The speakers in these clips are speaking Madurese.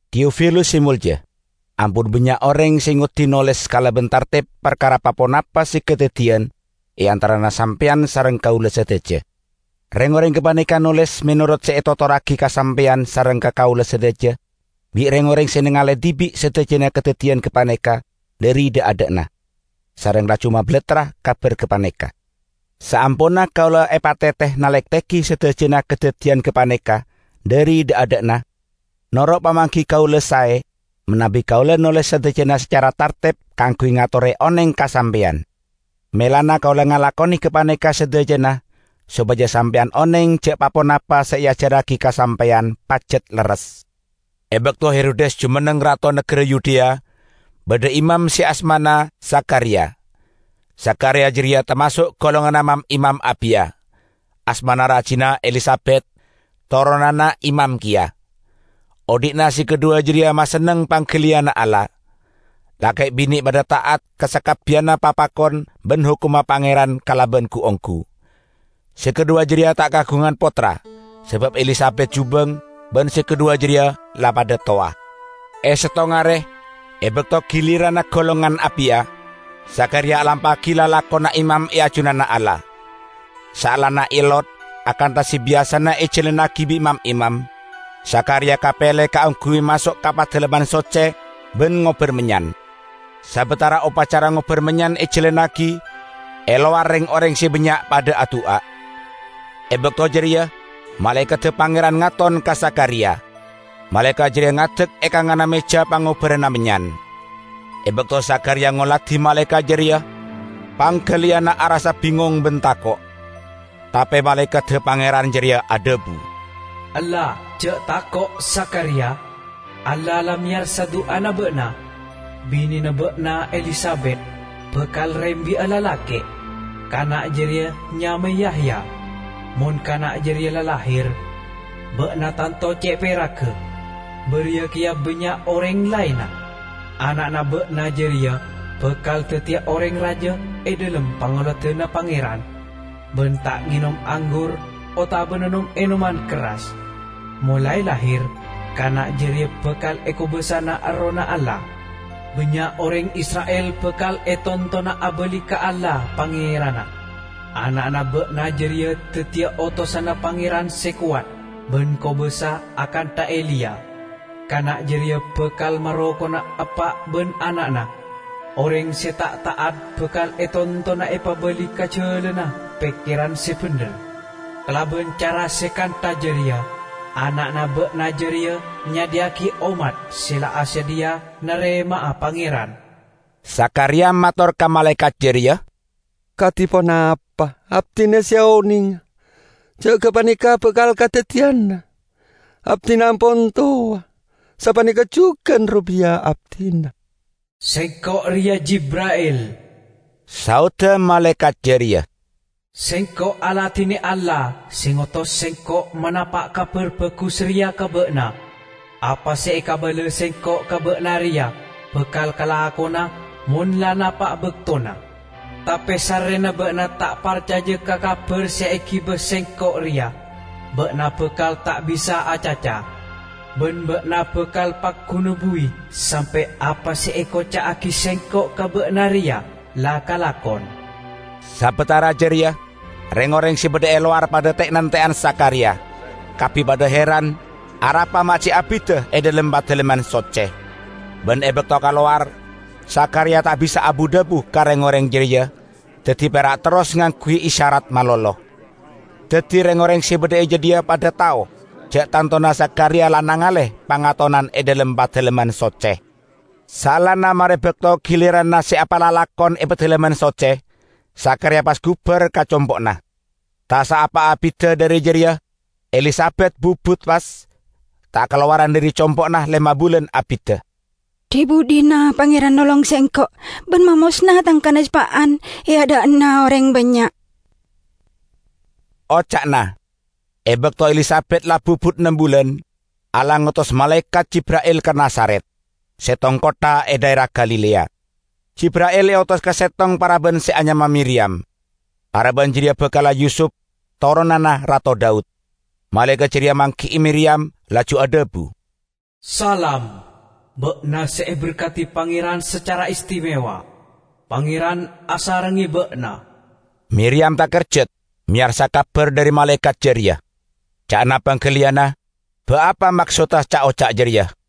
Teofilus se molja, Ampon bannya' oreng se ngoddi noles kalaban tartep parkara pa-ponapa se kadaddiyan e antarana sampeyan sareng kaula sadaja. Reng-oreng gapaneka noles menorot se etotorragi ka sampeyan sareng ka kaula sadaja bi' reng-oreng se nengale dibi' sadajana kadaddiyan gapaneka dhari dha'-adha'na, sareng laju mabalattra kabar gapaneka. Saamponna kaula epatete nalektegi sadajana kadaddiyan gapaneka dhari dha'-adha'na, noro' pamanggi kaula sae manabi kaula noles sadajana sacara tartep kaangguy ngatore oneng ka sampeyan. Melana kaula ngalakone gapaneka sadajana sopaja sampeyan oneng ja' pa-ponapa se eajarragi ka sampeyan pajat lerres. E bakto Herodes jumenneng rato nagara Yudea, badha imam se asmana Zakhariya. Zakhariya jareya tamaso' golonganna mam-imam Abiya. Asmana rajina Elisabet, toronanna imam keya. Odhi'na se kadhuwa jareya masenneng panggaliyanna Allah. Lake' bine' padha ta'at ka sakabbiyanna papakon ban hokomma Pangeran kalaban gu-onggu. Se kadhuwa jareya ta' kaagungan pottra sabab Elisabet jubeng ban se kadhuwa jareya la padha towa. E settong are, e bakto giliranna golongan Abiya, Zakhariya alampa'agi lalakonna imam e ajunanna Allah. Saellana eellot, akantha se biyasana ejalannagi bi' mam-imam, Zakhariya kapele kaangguy maso' ka Padalemman Socce ban ngobbar mennyan. Sabatara opacara ngobbar mennyan ejalannagi, e lowar reng-oreng se bannya' padha adu'a. E bakto jareya malaekadda Pangeran ngaton ka Zakhariya. Malaekat jareya ngadek e kanganna meja pangobbaranna mennyan. E bakto Zakhariya ngoladi malaekat jareya, panggaliyanna arassa bingong ban tako'. Tape malaekadda Pangeran jareya adhabu, "Ella, ja' tako', Zakhariya! Allah la meyarsa du'ana ba'na. Binena ba'na Elisabet bakal rembi'a lalake'. Kana' jareya nyamae Yahya. Mon kana' jareya la lahir, ba'na tanto ce' peragga, bariya keya bannya' oreng laenna! Ana'na ba'na jareya bakal daddiya oreng raja e dhalem pangoladanna Pangeran, ban ta' ngenom anggur otabana nom-enoman kerras. Molae lahir kana' jareya bakal ekobasa'ana Errohna Allah. Bannya' oreng Isra'il bakal etontona abali ka Allah, Pangeranna. Ana'na ba'na jareya daddiya otosanna Pangeran se kowat ban kobasa akantha Eliya. Kana' jareya bakal marokona eppa' ban ana'na, oreng se ta' ta'at bakal etontona epabali ka jalanna pekkeran se bendher. Kalaban cara se kantha jareya ana'na ba'na jareya nyadhiya'agi ommat se la asadhiya narema'a Pangeran." Zakhariya mator ka malaekat jareya, "Kadi ponapa abdina se onenga ja' gapaneka bakal kadaddiyana? Abdina ampon towa, sapaneka jugan robiya abdina." "Sengko' reya Jibra'il," saodda malaekat jareya. "Sengko' aladine Allah se ngotos sengko' manapa' kabar bagus reya ka ba'na. Apa se ekabala sengko' ka ba'na reya bakal kalakona mon la napa' baktona. Tape sarrena ba'na ta' parcaja ka kabar se egiba sengko' reya, ba'na bakal ta' bisa'a acaca; ban ba'na bakal pagguna buwi sampe' apa se ekoca'agi sengko' ka ba'na reya la kalakon." Sabatara jareya reng-oreng se badha e lowar padha te'-nante'an Zakhariya; kabbi padha heran arapa ma' ce' abidda e dhalem Padalemman Socce. Ban e bakto kalowar, Zakhariya ta' bisa abu-dhabu ka reng-oreng jareya, daddi pera' terros ngangguy isyarat malolo. Daddi reng-oreng se badha e jadhiya padha tao ja' tantona Zakhariya la nengale pangatonan e dhalem Padalemman Socce. Saellana mare bakto giliranna se epalalakon e Padalemman Socce, Zakhariya pas gubar ka compo'na. Ta' saapa abidda dhari jareya Elisabet bubut pas, ta' kalowaran dhari compo'na lema bulan abidda. "Dhi-budhina Pangeran nolong sengko' ban mamosna tang kanespa'an e adha'na oreng bannya'," oca'na. E bakto Elisabet la bubut nem bulan, Allah ngotos malaekat Jibra'il ka Nazaret, settong kottha e dhaera Galilea. Jibra'il eotos ka settong paraban se anyama Miriyam. Paraban jareya bakalla Yusup, toronanna Rato Daud. Malaekat jareya manggi'i Miriyam, laju adhabu, "Salam, ba'na se eberkadi Pangeran sacara istimewa. Pangeran asarengnge ba'na!" Miriyam takerjat meyarsa kabar dhari malaekat jareya; ca'na panggaliyanna ba' apa maksodda ca'-oca' jareya.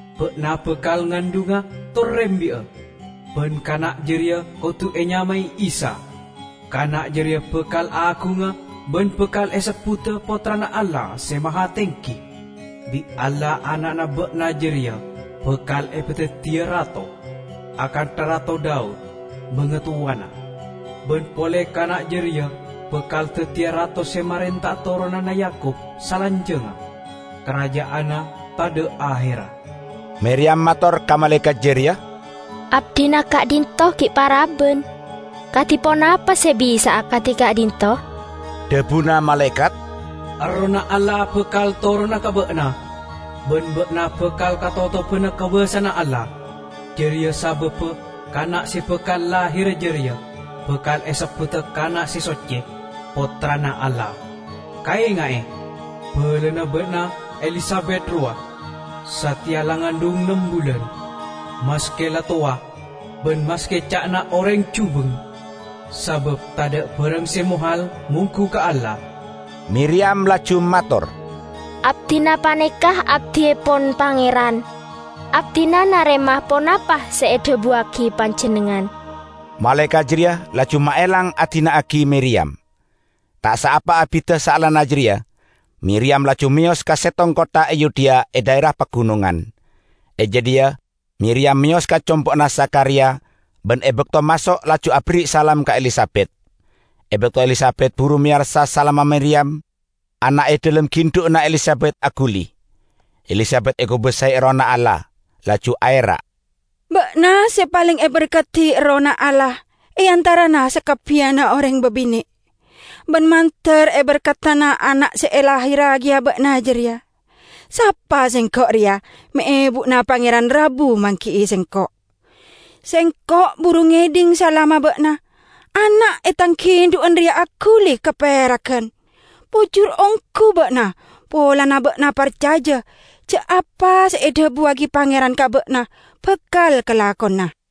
Ba'na bakal ngandhunga tor rembi'a, ban kana' jareya kodu enyamae Isa. Kana' jareya bakal agunga ban bakal esebbuda Pottrana Allah Se Mahatenggi. Bi' Allah ana'na ba'na jareya bakal epadaddiya rato, akantha Rato Daud, bangatowana. Ban pole kana' jareya bakal daddiya rato se marenta'a toronanna Yakub salanjangnga. Karaja'anna tadha' aherra." Miriyam mator ka malaekat jareya, "Abdina ka'dhinto' gi' paraban. Kadi ponapa se bisa'a kadi ka'dhinto'?" Dhabuna malaekat, "Errohna Allah bakal torona ka ba'na, ban ba'na bakal katotobana kobasana Allah. Jareya sababba kana' se bakal lahira jareya bakal esebbuda kana' se socce, Pottrana Allah. Kaenga'e, balana ba'na Elisabet rowa, sateya la ngandhung nem bulan, maske la towa, ban maske ca'na oreng jubeng. Sabab tadha' barang se mohal monggu ka Allah." Miriyam laju mator, "Abdina paneka abdiepon Pangeran; abdina narema ponapa se edhabuwagi panjennengngan." Malaekat jareya laju maelang adina'agi Miriyam. Ta' saapa abidda saellana jareya Miriyam laju meyos ka settong kottha e Yudea e dhaera pagunongan. E jadhiya Miriyam meyos ka compo'na Zakhariya, ban e bakto maso' laju aberri' salam ka Elisabet. E bakto Elisabet buru meyarsa salamma Miriyam, ana' e dhalem gindhu'anna Elisabet aguli. Elisabet ekobasae Errohna Allah, laju aera', "Ba'na se paleng eberkadi Errohna Allah e antarana sakabbiyanna oreng babine'! Ban mandar eberkadana ana' se elahirragiya ba'na jareya! Sapa sengko' reya me' ebuna Pangeran rabu manggi'i sengko'? Sengko' buru ngedhing salamma ba'na, ana' e tang gindhu'an reya aguli kaperagan. Pojur onggu ba'na polana ba'na parcaja ja' apa se edhabuwagi Pangeran ka ba'na bakal kalakona!"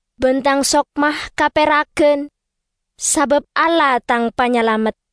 ban tang sokma kaperagan sabab Allah tang Panyalamet.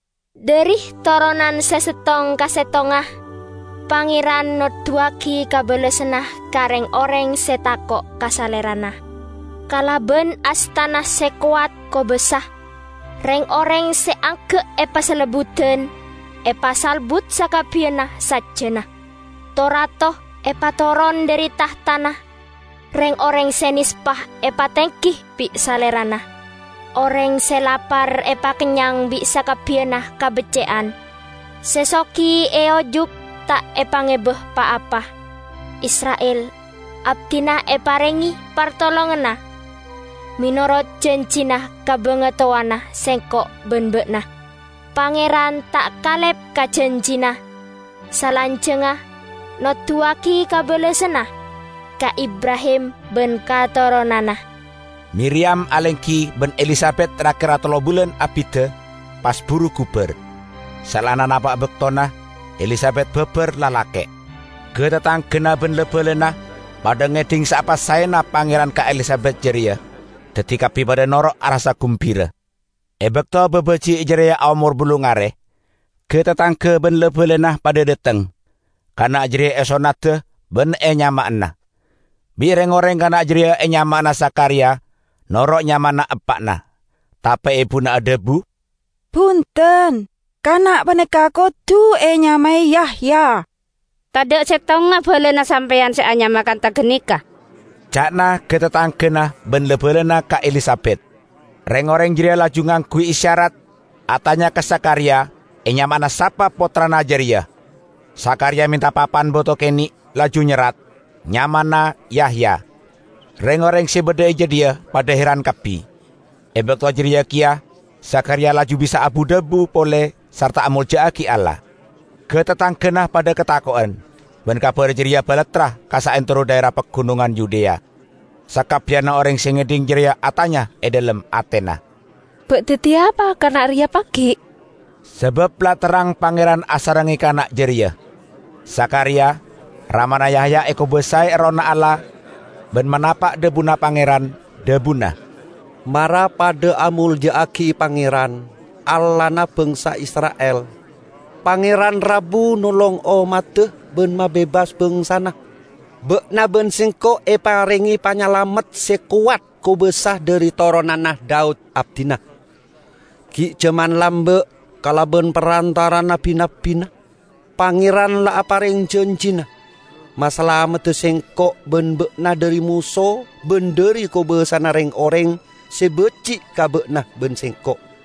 dhari toronan se settong ka settongnga Pangeran noduwagi kabellasanna ka reng-oreng se tako' ka Salerana. Kalaban astana se kowat kobasa reng-oreng se angga' epasalebbudan, epasalbut sakabbiyanna sajjana. To-rato epatoron dhari tahtana, reng-oreng se nespa epatenggi bi' Salerana. Oreng se lapar epakennyang bi' sakabbiyanna kabecce'an, se sogi eojuk ta' epangeba pa-apa. Isra'il abdina eparenge partolonganna, menorot janjina ka bangatowana sengko' ban ba'na. Pangeran ta' kalep ka janjina, salanjangnga noduwagi kabellasanna, ka Ibrahim ban ka toronanna." Miriyam alenggi ban Elisabet ra-kera tello bulan abidda, pas buru gubar. Saellana napa' baktona, Elisabet babar lalake'. Ga-tatanggana ban la-balana padha ngedhing saapa saena Pangeran ka Elisabet jareya, daddi kabbi padha noro' arassa gumbira. E bakto babaji' jareya aomor ballung are, ga-tatangga ban la-balana padha dhateng; kana' jareya esonnada ban enyama'ana. Bi' reng-oreng kana' jareya enyama'ana Zakhariya noro' nyamana eppa'na, tape ebuna adhabu, "Bunten! Kana' paneka kodu enyamae Yahya." "Tadha' settonga balana sampeyan se anyama kantha ganeka," ca'na ga-tatanggana ban la-balana ka Elisabet. Reng-oreng jareya laju ngangguy isyarat atanya ka Zakhariya enyama'ana sapa pottrana jareya. Zakhariya menta papan bato kene', laju nyerrat, "Nyamana Yahya." Reng-oreng se badha e jadhiya padha heran kabbi! E bakto jareya keya Zakhariya laju bisa abu-dhabu pole sarta amolja'agi Allah. Ga-tatanggana padha katako'en, ban kabar jareya balattra ka saantero dhaera Pagunongan Yudea. Sakabbiyanna oreng se ngedhing jareya atanya e dhalem atena, "Ba' daddiya apa kana' reya pagi'?" Sabab la terrang Pangeran asarengnge kana' jareya. Zakhariya, ramana Yahya ekobasae Errohna Allah ban manapa' dhabuna Pangeran, dhabuna: "Mara padha amolja'agi Pangeran, Allahna bangsa Isra'il! Pangeran rabu nolong ommadda ban mabebas bangsana. Ba'na ban sengko' eparenge Panyalamet se kowat kobasa dhari toronanna Daud, abdina. Gi' jaman lamba' kalaban parantara'anna bi-nabbina, Pangeran la apareng janjina masalamedda sengko' ban ba'na dhari moso ban dhari kobasana reng-oreng se baji' ka ba'na ban sengko'.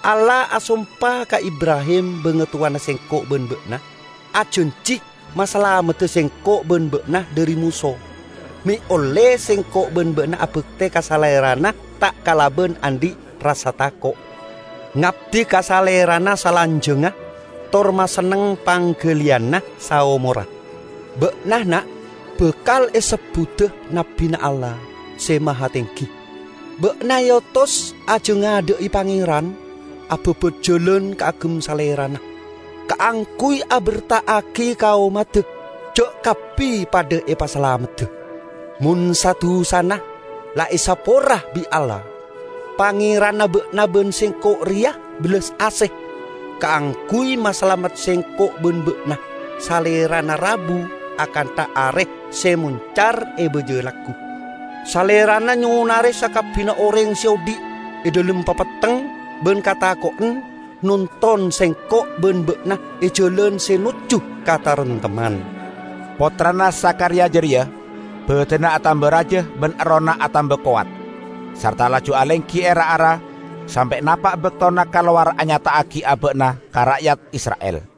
Allah asompa ka Ibrahim bangatowana sengko' ban ba'na, ajanji masalamedda sengko' ban ba'na dhari moso, me' olle sengko' ban ba'na abakte ka Salerana ta' kalaban andhi' rassa tako', ngabdi ka Salerana salanjangnga, tor masenneng panggaliyanna saomorra. Ba'na, na', bakal esebbuda nabbina Allah Se Mahatenggi. Ba'na eotos ajangadha'i Pangeran ababat jalan kaagem Salerana, kaangguy aberta'agi ka ommadda, ja' kabbi padha epasalamedda mon sa-dusana la esapora bi' Allah. Pangeranna ba'na ban sengko' reya bellas ase; kaangguy masalamet sengko' ban ba'na Salerana rabu. Akantha are se moncar e baja laggu, Salerana nyonare sakabbiyanna oreng se odhi' e dhalem papetteng ban katako'en. Nonton sengko' ban ba'na e jalan se nojju ka kataremtemman." Pottrana Zakhariya jareya badanna atamba raja ban errohna atamba kowat. Sarta laju alenggi e ra-ara sampe' napa' baktona kalowar anyata'agi aba'na ka ra'yat Isra'il.